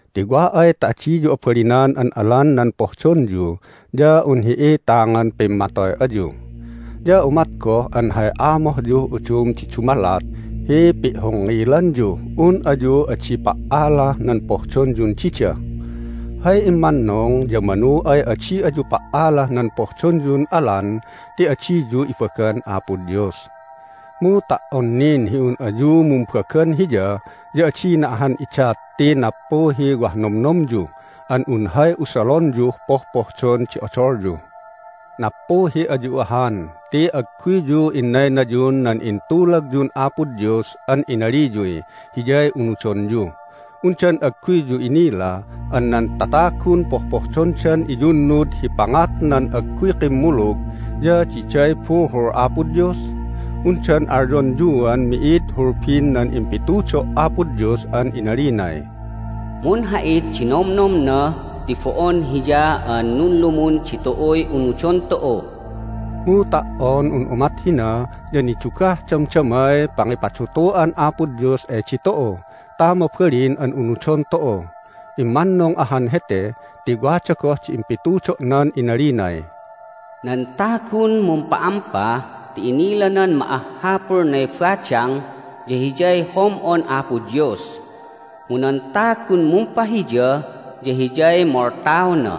Ti wa ay ta adiyu abalinan an alan nan pohdonyu ya un hi'itangan pimmatoy ayu. Ya umat goh an hay amohyuh udum di dumalat hi pi'hongngilanyuh un ayu adi pa"alah nan pohdonyun dida. Hay immannung ya manu ay adi ayu pa"alah nan pohdonyun alan ti adiyu ibagan Apo Dios. Mu ta"on nin hi un ayu mumbagan Hiya ya adina ahan idat ti nappuhiy wah nomnomyu an un hay usalonyuh pohpohdon di odolyu. Nappuhi ayu ahan ti agguyyu innaynayun nan intulagyun Apo Dios an inaliyuy Hiyay unudonyu. Undan agguyyu inila an nan tatagun pohpohdondan iyunnud hi pangat nan agguy kimmulug ya diday buhul Apo Dios? Undan alyonyuan mi'id hulbin nan impitudo' Apo Dios an inalinay, "Munha'it di nomnomna ti bo'on Hiya an nunlumun ditu'uy unudon tu'u." Mu ta"on un umat hina ya nidugah damdamay pangipadutu'an Apo Dios ay ditu'u ta mabalin an unudon tu'u. Immannung ahan hete ti wada goh di impitudo'nan inalinay, "Nan tagun mumpa'ampa ti inilanan ma'ahhapulnay badang ya hiyay hom'on Apo Dios, mu nan tagun mumpahiya ya hiyay moltaona."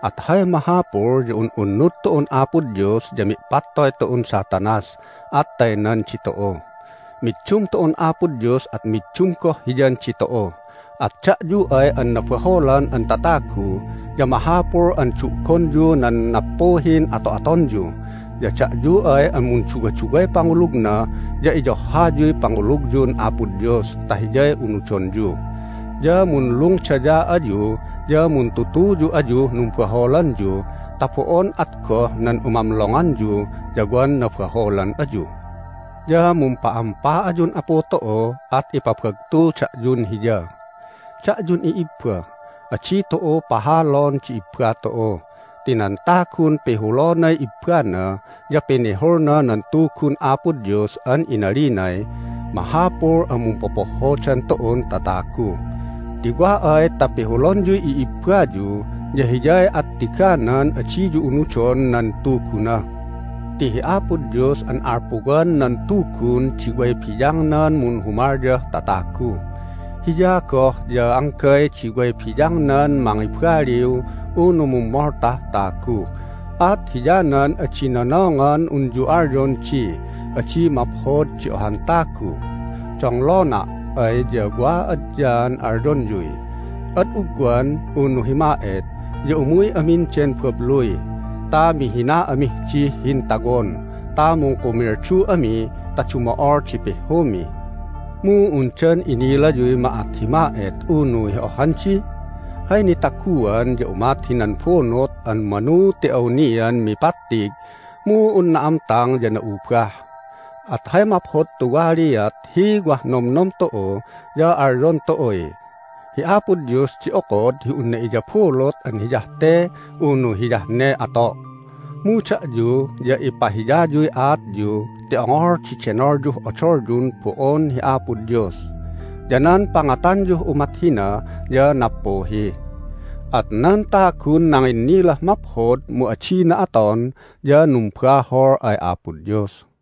At hay mahapul ya un'unnud tu'un Apo Dios. Ya mi'patoy tu'un Satanas, at taynan ditu'u. Middum tu'un Apo Dios, at middum goh Hiyan ditu'u. At da'yu ay an nabaholan an tatagu ya mahapul an du'gonyu nan nappuhin ato'atonyu. Ya da'yu ay an munduwaduway pangulugna ya iyohhayuy pangulugyun Apo Dios ta Hiyay unudonyu! Ya munlungdaya ayu ya muntutuyu ayuh numbaholanyu ta bo'on at goh nan umamlonganyu ya wan nabaholan ayu. Ya mumpa'ampa ayun Apu tu'u, at ipabagtu da'yun Hiya. Da'yun i'ibba, adi tu'u pahalon di ibba tu'u. Ti nan tagun pihulonay ibbana ya pinihulna nan Tugun Apo Dios an inalinay mahapul an mumpopohhodan tu'un tatagu. Ti wa ay ta pihulonyuy i'ibbayu ya hiyay attiganan adiyu unudon nan Tuguna. Ti hi Apo Dios an alpuwan nan Tugun di way biyangnan munhumalyah tatagu. Hiya goh ya anggay di way biyangnan mangibaliw unu mummoltah tagu, at hiyanan adi nonongan unyu alyon di adi maphod di ohan tagu. Donglona' ay ya wa adyaan alyonyuy, "Ad ugwan (unu hi ma'et) ya umuy amin den babluy ta mihina amih dih hintawon ta mungkumildu ami ta dumo'ol di pihhumi." Mu undan inilayuy ma'at hi ma'et unu hi ohhandi? Hay nitaguan ya umat hinan bunut an manu ti awnian mipattig, mu un na'amtang ya na'ubah. At hay maphod tuwaliat hi wah nomnom tu'u ya alyon tu'uy, "Hi Apo Dios di okod hi unna iyabulut an hiyah te (unu hiyah ne) ato'." Mu da'yu ya ipahiyayuy aatyu ti ongol di denolyuh odolyun bo'on hi Apo Dios. Ya nan pangatanyuh umat hina ya nappuhi. At nan tagun nanginnilah maphod mu adina aton ya numbahol ay Apo Dios.